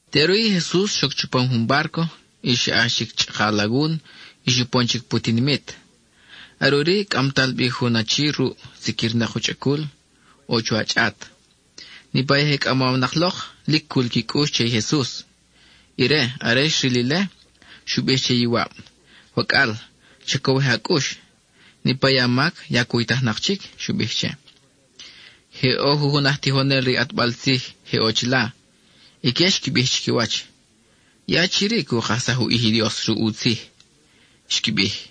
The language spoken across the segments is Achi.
Teʼuri i Jesus xoc chupam jun bárco y xa ʼax chic chʼaka alagun y xupon chic pu tinimit. Are ʼuri cʼamtal bi jun achi ruʼ, siquirnak u chʼacul, ʼo chuwa chʼat. Niʼpa i je cʼamawnak lok, lic cul qui cʼux che i Jesus. Ire, are xril ile, xu bij che i iwab: —Wacʼal, cha cowij a cʼux; niʼpa i a mac ya cuytajnak chic —xu bij che. Je ʼo jujun aj tijonel re i ʼatbal tzij je ʼo chila. Ique xqui bij chiquiwach: “I achi-ri cu kajsaj u ʼij i Dios ruʼ u tzij,” xqui bij.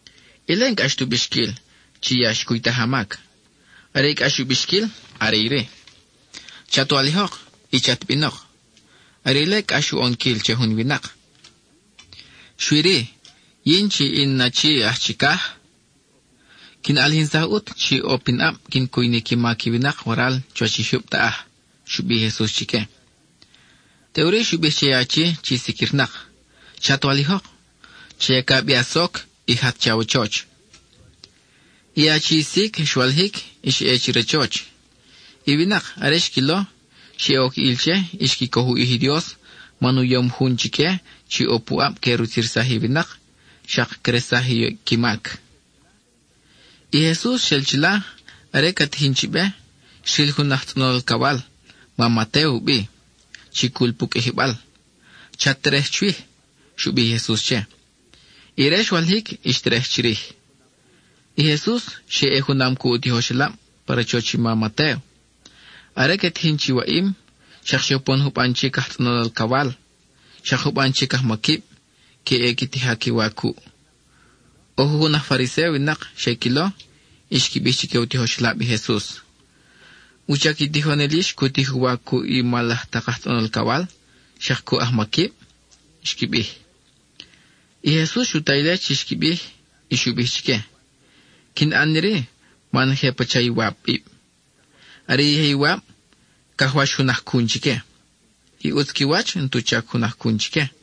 Ile, n-cʼax tu bixquil chi “Ya xcuytaj a mac.” Are i cʼax u bixquil are iri: “Chat walijok, y chat binok,” are ile cʼax u ʼonquil che jun winak. Xui-ri, yin chi in Achi aj Chicaj, quin ʼalijinsaj ʼut chi ʼo pinʼab quin cuy ni qui mac i winak waral chuwach i jyub taʼaj —xu bij i Jesus chique. Teʼuri xu bij che i achi chi siquirnak: —Chat walijok, cha yaca bi a soc, y jat che awachoch. I achi sic xwalijic y xa ʼe che rachoch. I winak, are xquilo, xe oc ʼil che y xqui coj u ʼij i Dios man u yom jun chique chi ʼo puʼab que rutzirsaj i winak, xak cresaj i qui mac. I Jesus xel chila; are ca tijin chi be, xril jun aj tzʼonol alcawal, ma Matéo u bi, chi cul pu qʼuijibal. —Chat terej chwij —xu bij i Jesus che. Ire xwalijic y xterej chirij. I Jesus xe ʼe junam cuʼ u tijoxelab pa rachoch i ma Matéo. Are que tijin chi waʼim, xak xe upon juban chic aj tzʼonol alcawal, xak juban chic ajmaquib, que ʼe qui tija qui wa cuʼ. ʼO jujun aj Fariséo winak xe quilo, y xqui bij chique u tijoxelab i Jesus: —¿Wuchac i tijonel yix cu tij u wa cuʼ i mal laj tak aj tzʼonol alcawal, xak cuʼ ajmaquib? —xqui bij. I Jesus xu ta ile chi xqui bij, y xu bij chique: —Quin ʼan iri man je pacha iwabib. Are i je iwab cajwax jun ajcun chique; i ʼutz qui wach n-tu chac ajcun chique.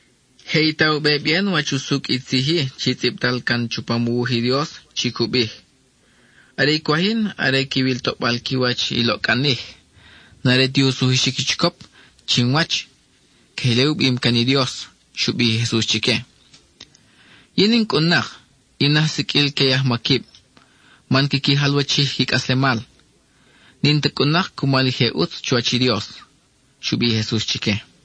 Je i ta u be bien wach usucʼ i tzij-i chi i tzʼibtal can chupam u wuj i Dios chi cu bij: “Are i cwaj yin are quiwil toʼbal qui wach i loʼcʼanij; n-are ti u sujuxic i chicop chinwach.” Queje ile u bim can i Dios —xu bij i Jesus chique—. Yin in cʼun-nak in aj siqʼuil que i ajmaquib, man quiqui jalwachij qui cʼaslemal. N-in ta cʼun-nak cumal i je ʼutz chuwach i Dios —xu bij i Jesus chique.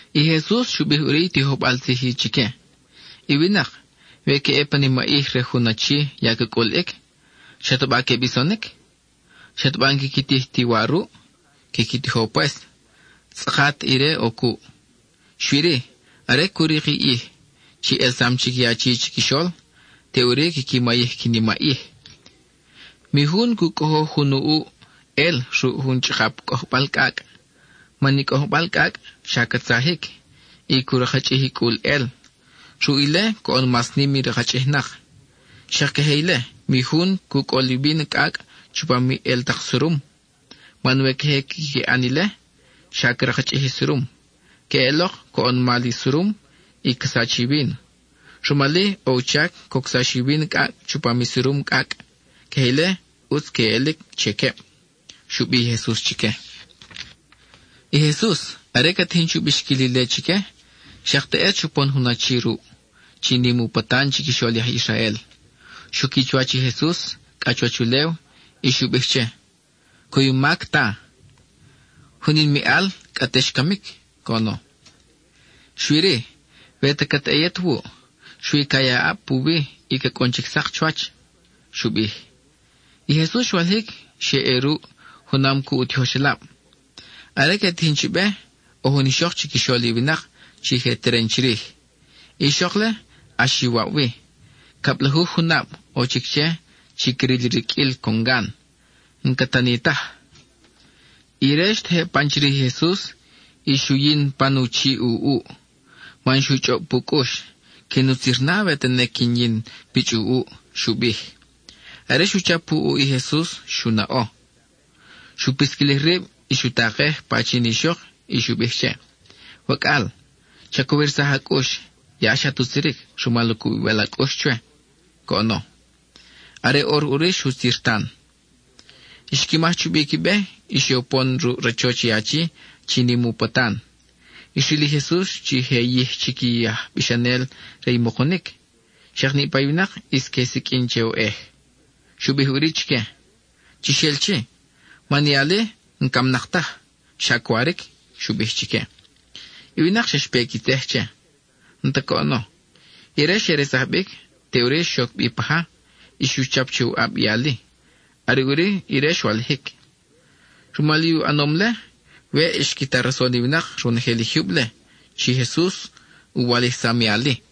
I Jesus xu bij ʼuri i tijojbal tzij-i chique: —I winak, we que ʼe pa nimaʼij re jun achi ya ca cʼuliʼic, ¿xataba que bisonic? ¿xataba n-quiqui tij ti wa ruʼ? Quiqui tijo pues, tzʼakat ire ʼo cuʼ. Xui-ri, are cu rik i ʼij chi ʼelsam chic i achi chiquixol, teʼuri quiqui mayij qui nimaʼij. —Mi jun cu cʼojoj jun u ʼuʼ ʼel ruʼ jun chʼakap cʼojbal cʼacʼ, man i cʼojbal cʼacʼ xa ca tzajic y cu rakchʼij i cʼul ʼel; ruʼ ile coʼon mas nim i rakchʼijnak. Xak queje ile, mi jun cu cʼol i víno cʼacʼ chupam i ʼel tak surum, man we queje quiqui ʼan ile, xa ca rakchʼij i surum. Queʼelok, coʼon mal i surum, y ca sach i víno. Rumal-i, ʼo u chac cocsax i víno cʼacʼ chupam i surum cʼacʼ; queje ile ʼutz queʼelic che queb —xu bij i Jesus chique. I Jesus, are ca tijin chu bixquil ile chique, xak teʼet xupon jun achi ruʼ, chi nim u patan chiquixol i aj Israel. Xuqui chuwach i Jesus cʼa chuwach ulew y xu bij che: —Cuymac, Ta, jun in miʼal cʼa te xcamic —coʼono—. Xui-ri, we ta cat ʼe yet wuʼ, xui ca ya a ʼab puwi y ca cʼun chic sak chuwach —xu bij. I Jesus xwalijic y xe ʼe ruʼ, junam cuʼ u tijoxelab. Are que tijin chi be, ʼo jun ixok chiquixol i winak chi je teren chirij. I ixok-le, ʼax iwab wi; cablajuj junab ʼo chic che chi cril i riqʼuil congan; n-ca tani taj. Ire xtejeb pan chirij i Jesus y xu yin pan u chiʼ u ʼuʼ, man xu chʼob pu cʼux: “Quin utzir na we tene quin yin pichʼ u ʼuʼ,” xu bij. Are xu chap u ʼuʼ, i Jesus xu naʼo; xu pisquilij rib, xu takej pan i ixok y xu bij che: —Wacʼal, cha cowirsaj a cʼux; ya xat utziric rumal u cubibal a cʼux chwe —coʼono. Are ʼor ʼuri xutzir tan. Xqui maj chubi qui be, y xe upon ruʼ rachoch i achi chi nim u patan. Xril i Jesus chi je yij chic i aj bixanel re i mukunic, xak niʼpa i winak ʼis que siqʼuin che oʼej, xu bij ʼuri chique: —Chix el chi, man i ali n-camnak taj, xa cwaric —xu bij chique. I winak xa xpe qui tzej che. N-ta coʼono, ire xe resaj bic; teʼuri xoc bi pa ja, y xu chap che u ʼab i ali; are ʼuri ire xwalijic. Rumal i u ʼanom-le, weʼ xqui ta rason i winak ronojel i jyub-le, chi Jesus u walijsam i ali.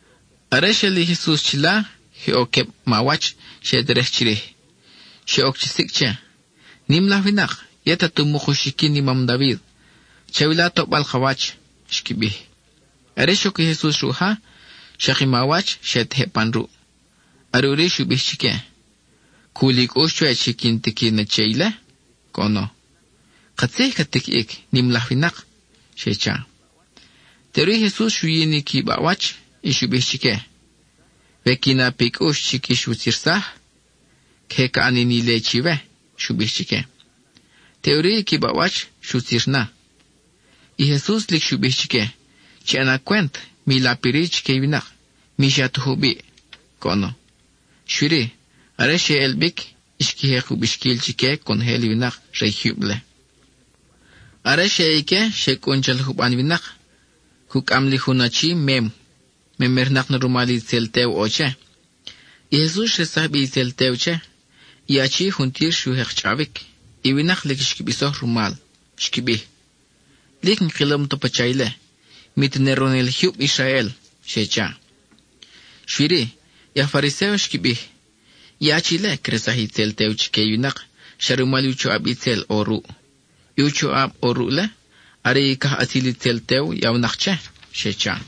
Are xel i Jesus chila, je ʼo queb mawach xe terej chirij; xe oc chi sicʼ che. —¡Nim laj winak, yet at umuk uxiquin i mam David, chawila toʼbal ka wach! —xqui bij. Are xoc i Jesus ruʼ ja, xak i mawach xe tejeb pan ruʼ. Are ʼuri xu bij chique: —¿Cul i cʼux chwe chi quin tiqui na che ile? —coʼono. —Katzij cat tiquiʼic, nim laj winak —xe cha. Teʼuri i Jesus xu yin i qui baʼwach, y xu bij chique, —We qui na pi cʼux chi quix wutzirsaj, queje ca ʼan ni ile chiwe —xu bij chique. Teʼuri i qui baʼwach xutzir na. I Jesus lic xu bij chique: —Chi ʼana cwent, mi lap iri chique i winak, mi xa ta jubiʼ —coʼono. Xui-ri, are xe ʼel bic, xqui jek u bixquil chique conojel i winak re i jyub-le. Are xe ʼe ique, xe cʼun chal juban winak, cucʼam li jun achi mem. Memernak na rumal itzel tew ʼo che. I Jesus xresaj bi itzel tew che, i achi juntir xu jek chʼawic. I winak lic xqui bisoj rumal. Xqui bij: —Lic n-kilom ta pacha ile, mi tene ronojel i jyub Israel —xe cha. Xui-ri, i aj Fariséo xqui bij: —I achi-le cresaj i itzel tew chique i winak xa rumal u choʼab itzel ʼo ruʼ; i choʼab ʼo ruʼ-le, are i cajʼatzil itzel tew yawnak che —xe cha.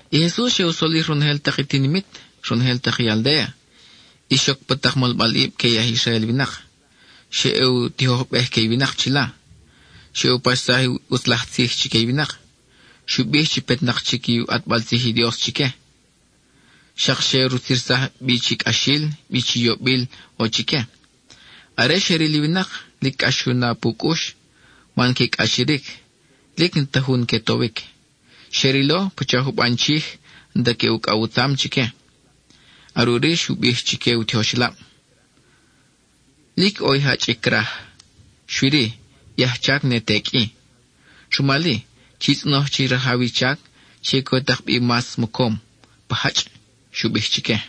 I Jesus xe u solij ronojel tak i tinimit, ronojel tak i aldéa. ʼIs xoc pa tak molbalʼib que i aj Israel winak, xa ʼe u tijojbej que i winak chila; xa ʼe u paxsaj i ʼutz laj tzij chique i winak, xu bij chi petnak chic i u ʼatbal tzij i Dios chique. Xak xe rutzirsaj bi chi cʼaxil, bi chi yobil, ʼo chique. Are xe ril i winak, lic cʼax xu na pu cʼux, man que cʼachiric, lic n-ta jun que towic; xe rilo pacha juban chij, n-ta que ucʼaw u tzam chique. Are ʼuri xu bij chique u tijoxelab: —Lic ʼo i jachʼic craj; xui-ri, i ajchac ne te qʼui. Rumal-i, chi tzʼonoj che i Rajaw i chac chi que u tak bi mas mocom pa jachʼ —xu bij chique.